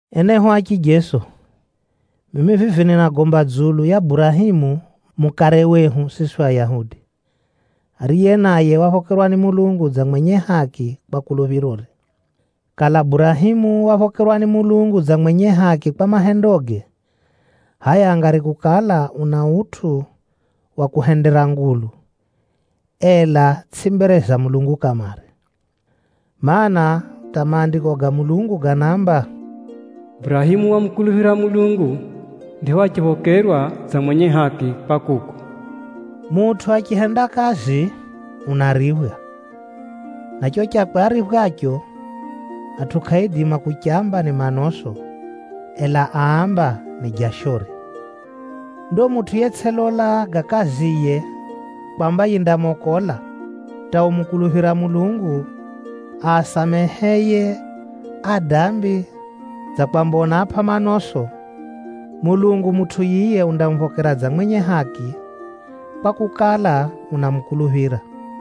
Enehu a chijeso, mimi vivi ninagomba dzulu ya Burahemu mukare wehu siswi Ayahudi, ariye naye waphokerwa ni Mulungu dza mwenye haki kwa kuluphirore. Kala Burahemu waphokerwa ni Mulungu dza mwenye haki kwa mahendoge, hʼaya angari kukala una utʼu wa kuhendera ngulu, ela tsʼi mbere za Mulungu kamare. Maana, hata Maandiko ga Mulungu ganaamba, “Burahemu wamukuluphira Mulungu, ndipho achiphokerwa dza mwenye haki kwa kuko.” Mutʼu achihenda kazi, unariphwa, na cho chakwe ariphwacho, atʼu kʼaaidima kuchamba ni manoso, ela amba ni jashore. Ndo mutʼu yetsʼilola ga kaziye kwamba yindamokola, hata umukuluphira Mulungu asameheye adambi dza kwamba unaapʼa manoso, Mulungu mutʼu yiye undamuphokera dza mwenye haki, kwakukala, unamukuluphira.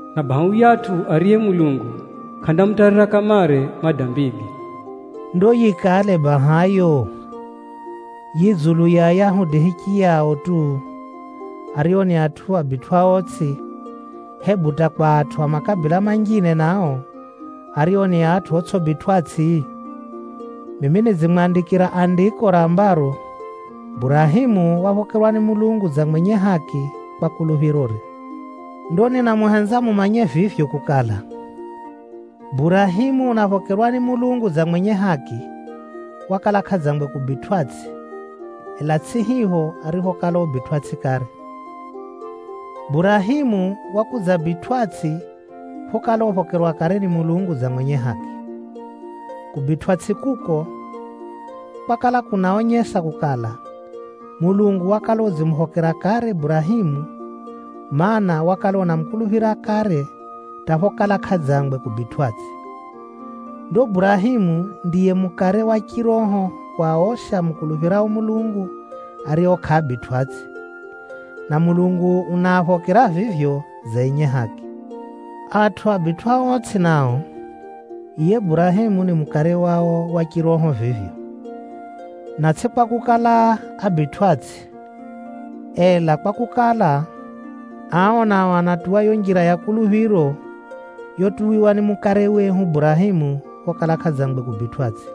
Na baha mutʼu ariye Mulungu kʼamutarira kamare madambige.” Ndo yikale baha yo, yi dzulu ya Ayahudi hichiyao tu, ario ni atʼu abitwʼaotsʼi, hebu hata kwa atʼu a makabila manjine nao, ario ni atʼu otsʼibitwʼatsʼi? Mimi nidzimwandikira Andiko rambaro, “Burahemu waphokerwa ni Mulungu dza mwenye haki kwa kuluphirore.” Ndo ninamuhenza mumanye vivyo kukala, Burahemu unaphokerwa ni Mulungu dza mwenye haki, wakala kʼadzangwe kubitwʼatsʼi, ela tsʼi hipho ariphokala ubitwʼatsʼi kare. Burahemu wakudzabitwʼatsʼi phokala uphokerwa kare ni Mulungu dza mwenye haki. Kubitwʼatsʼi kuko, kwakala kunaonyesa kukala, Mulungu wakala udzimuphokera kare Burahemu, mana, wakala unamukuluphira kare hata phokala kʼadzangwe kubitwʼatsʼi. Ndo Burahemu ndiye mukare wa chiroho wa osi amukuluphirao Mulungu ario kʼaabitwʼatsʼi, na Mulungu unaaphokera vivyo dza enye haki. Atʼu abitwʼaotsʼi nao, yiye Burahemu ni mukare wao wa chiroho vivyo. Na tsʼi kwakukala ábitwʼatsʼi, ela kwakukala, ao nao anatuwa yo njira ya kuluphiro yotuwiwa ni mukare wehu Burahemu phokala kʼadzangwe kubitwʼatsʼi.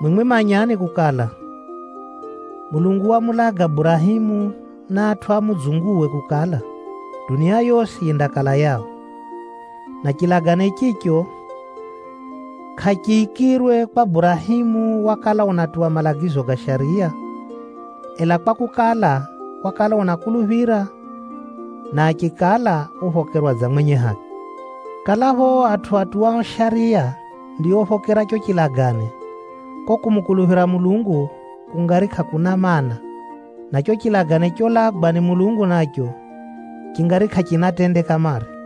Mwimwi manyani kukala, Mulungu wamulaga Burahemu na atʼu a mudzunguwe kukala, dunia yosi yindakala yao. Na chilagane chicho, kʼachiikirwe kwa Burahemu wakala unatuwa malagizo ga Shariya, ela kwakukala, wakala unakuluphira, na achikala uphokerwa dza mwenye haki. Kalapho o atʼu atuwao Shariya ndiophokera cho chilagane, ko kumukuluphira Mulungu kungari kʼakuna mana, na cho chilagane cholagwa ni Mulungu nacho, chingari kʼachina tende kamare.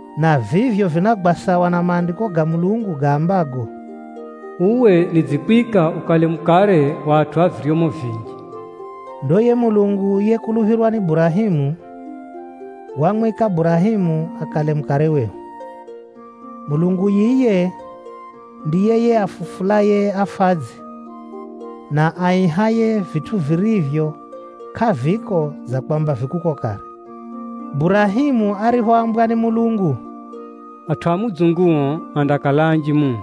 na vivyo vinagwa sawa na Maandiko ga Mulungu gaambago, “Uwe nidzikuhenda ukale mukare wa atʼu a viryomo vinji.” Ndo yiye Mulungu yekuluphirwa ni Burahemu, wamwika Burahemu akale mukare wehu. Mulungu yiye ndiye yiye afufulaye afadzi, na aihaye vitʼu virivyo kʼaviko dza kwamba vi kuko kare. Burahemu ariphoambwa ni Mulungu, “Atʼu a mudzunguo andakala anji muno,”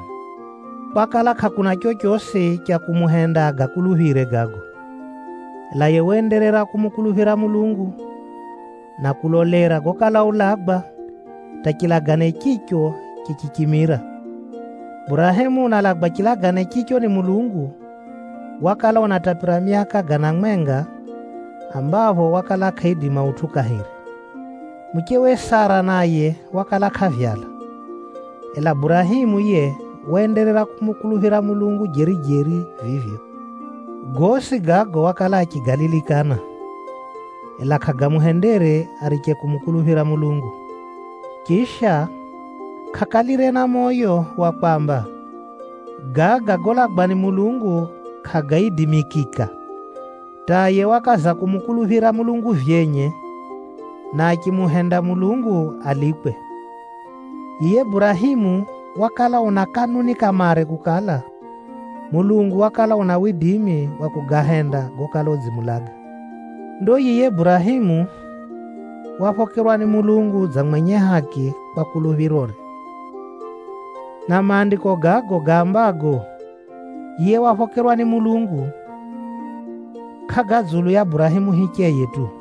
kwakala kʼakuna chochosi cha kumuhenda agakuluphire gago. Ela yiye waenderera kumukuluphira Mulungu, na kulolera gokala ulagwa, hata chilagane chicho chichichimira. Burahemu unalagwa chilagane chicho ni Mulungu, wakala unatapira myaka gana mwenga, ambapho wakala kʼaidima utʼu kahiri. Muchewe Sara naye wakala kʼavyala, ela Burahemu yiye waenderera kumukuluphira Mulungu jeri-jeri vivyo. Gosi gago wakala achigalilikana, ela kʼagamuhendere ariche kumukuluphira Mulungu. Chisha, kʼakalire na moyo wa kwamba, “Gaga golagwa ni Mulungu kʼagaidimikika,” hata yiye wakaza kumukuluphira Mulungu vyenye, na achimuhenda Mulungu alikwe. Yiye Burahemu wakala una kanuni kamare kukala, Mulungu wakala una widimi wa kugahenda gokala udzimulaga. Ndo yiye Burahemu, “waphokerwa ni Mulungu dza mwenye haki kwa kuluphirore.” Na Maandiko gago gaambago, “Yiye waphokerwa ni Mulungu,” kʼaga dzulu ya Burahemu hicheye tu.